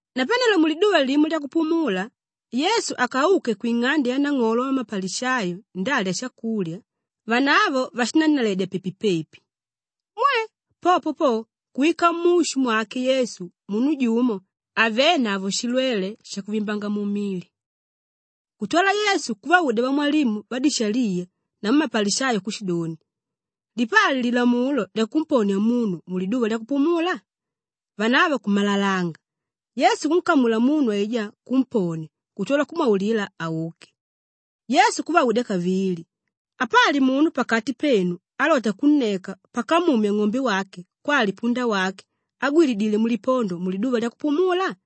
Napanelo muliduva limo lyakupumula, Yesu akauke kwing'ande yanang'olo wamapalishayo ndalya shakulya, vanavo vashinannaledya pepi-pepi. Mwe! Popo po, kuwika mushu mwake Yesu munu jumo avénavo shilwele shakuvimbanga mili. Kutwala Yesu kuvaudya vamwalimu vadishaliya namu mapalishayo kushidoni, “Lipali lilamulo lyakumponia munu muliduva lyakupumula?” Vanavo kumalalanga. Yesu kunkamula munu aijá kumponia kutwala kumwaulila auke. Yesu kuvaudya kavili, “Apali munu pakati penu álota kunneka pakamumya ng'ombe wake kwali punda wake àgwilidile mulipondo muliduva lyakupumula?”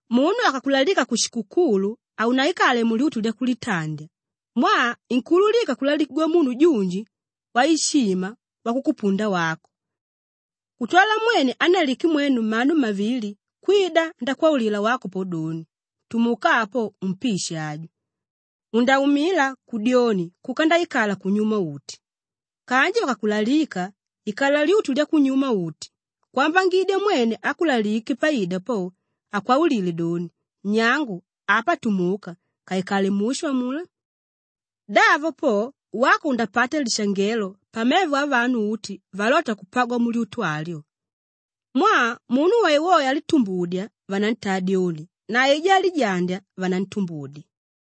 “Munu akakulalika kushikukulu, haunaikale mulyutu lyakulitandya mwaa inkuululika kulalikigwa munu junji waishima wakukupunda wako. Kutwala mwene ánnalike mwenu mmanu mmavili kwida ndakwaulila wako po doni, ‘Tumuka apo umpishe aju!’ Undaumila kudyoni kuka ndaikala kunyuma-uti. Kanji vakakulalika, ikala lyutu lyakunyuma-uti kwambangidya mwene ákulalike paida po, akwaulile doni, ‘Nyangu, apa tumuka ukaikale mushu amulá.’ Davo po wako undapata lishangelo pamevo avanu uti valota kupagwa mulyutu alyo. Mwaa, munu woewoe álitumbudya vanantaa dyoni na aijá álijandya vanantumbudya.”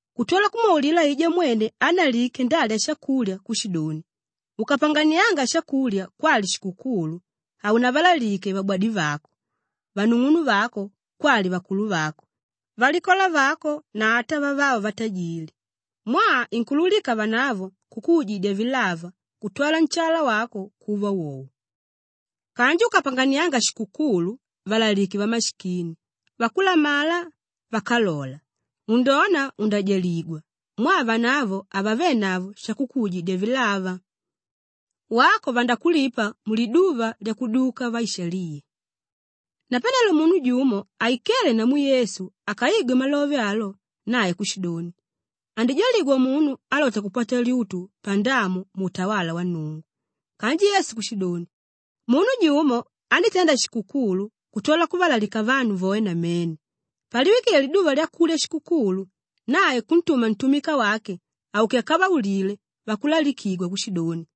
Kutwala kumwaulila aijá mwene ánnalike ndalya shakulya kushidoni, “Ukapanganianga shakulya kwali shikukulu, haunavalalike vabwadivako, vanung'unuvako kwali vakuluvako, valikola vako na ata vavavo vatajili; mwaa inkuululika vanavo kukuujidya vilava kutwala nshala wako kuva wowo. Kanji ukapanganianga shikukulu, valalike vamashikini, vakulamala, vákalola, undona undajaligwa mwaa vanavo havavenavo shakukuujidya vilava. Wako vandakulipa muliduva lyakudyuka vaishaliya.” Napanelo munu jumo aikéle namu Yesu akaigwe malove alo, nae kushidoni, “Andijaligwa munu álota kupata lyutu pandamu muutawala wa Nnungu.” Kanji Yesu kushidoni, “Munu jumo andítenda shikukulu kutwala kuvalalika vanu voe namene. Paliwikile liduva lyakulya shikukulu, nae kuntuma ntumika wake auke akavaulile vakulalikigwa kushidoni,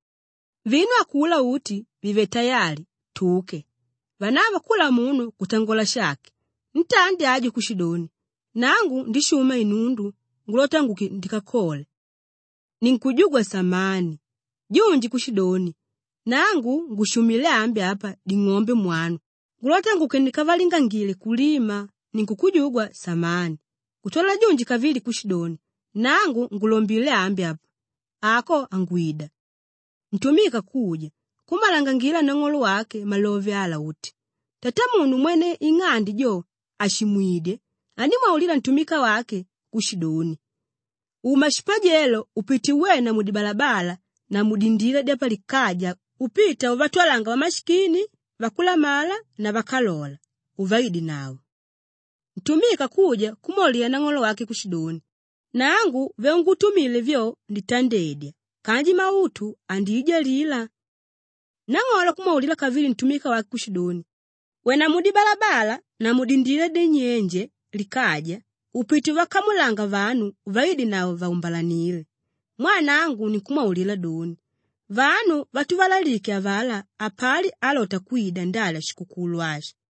‘Vinu akulá uti vivele tayali, tuke!’ Vanavo kula munu kutangola shake. Ntandi aju kushidoni, ‘Nangu ndishuma inundu ngulota nguke ndikalole; ninkujugwa samani!’ Junji kushidoni, ‘Nangu ngushumilé ambi apa ding'ombe mwanu ngulota nguke ndikavalingangile kulima; ninkujugwa samani!’ Kutwala junji kavili kushidoni, ‘Nangu ngulombilé ambi apa, ako hangwida.’ Ntumika kuja, kummalangangila nang'olo wake malove ala uti; tatamunu mwene ing'ande jo àshimwidye andímwaulila ntumika wake kushidoni, ‘Uma shipajelo upite uwena mudibalabala na mudindila dyapalikaja upita uvatwalanga vamashikini, vakulamala namu vákalola uvaidenavo.’ Ntumika kuja kumwaulila nang'olo wake kushidoni, ‘Nangu vyaungutumile vyo, nditandedya kanji mautu andiijalila.’ Nang'olo kumwaulila kavili ntumika wake kushidoni, ‘Wena mudibalabala na mudindila dyanyenje likaja upite uvakamulanga vanu uvaidenavo vaumbalanile mwaa nangu ninkumwaulila doni, vanu vatuvalalike avalá hapali álota kwida ndalya shikukulu ashi.’”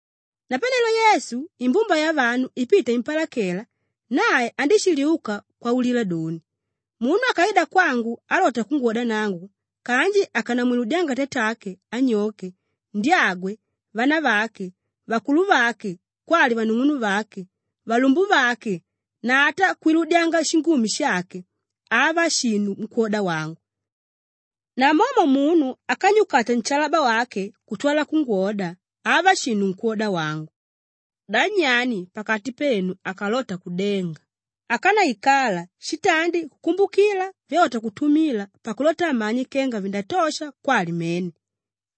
Napanelo Yesu, imbumba yavanu ipita impalakela, nae andíshiliuka kwaulila doni, “Munu akaida kwangu alota kungwoda nangu kanji akanamwiludyanga tatake, anyoke, ndyagwe, vanavake, vakuluvake kwali vanung'unuvake, valumbuvake na ata kwiludyanga shingumi shake, hava shinu nkwóda wangu. Namomo munu ákanyukata nshalaba wake kutwala kungwoda, hava shinu nkwóda wangu. Da nyani pakati penu akalota kudenga, ákanaikala shitandi kukumbukila vyalota kutumila pakulota amanye kenga vindatosha kwali mene?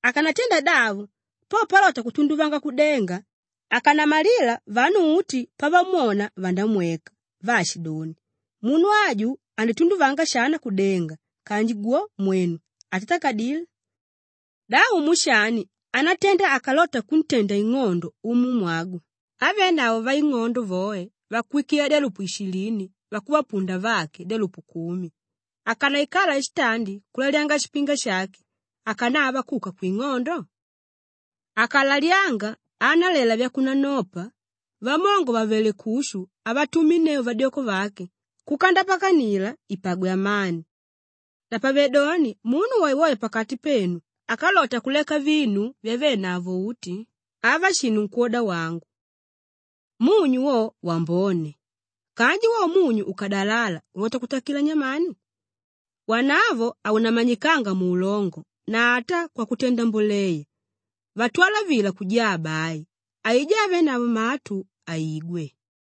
Akanatenda davo, po palota kutunduvanga kudenga, akanamalila vanu uti pavamwona vandamweka vaashidoni, ‘Munu aju andítunduvanga shana kudenga kanji gwo, mwenu, atatakadile.’ Da umu shani ánatenda akalota kuntenda ing'ondo umumwagwe ávenavo vaing'ondo voe vakuwikila dyalupu ishilini vakuvapunda vake dyalupu kumi, ákanaikala shitandi kulalyanga shipinga shake akanava kuka kwing'ondo? Akalalyanga, aanalela vyakunanopa, vamongo vàvele kushu avatuminneu vadyoko vake kuka ndapakanila ipagwe amani. Napavedoni munu woewoe pakati penu ákalota kuleka vinu vyavenavo uti, hava shinu nkwóda wangu. Munyu wo, wambone. Kanji wo munyu ukadalala ulota kutakila nyamani? Wanavo haunamanyikanga muulongo na ata kwakutenda mboleya, vatwala vila kujaa bai. Aijá ávenavo matu, aigwe.”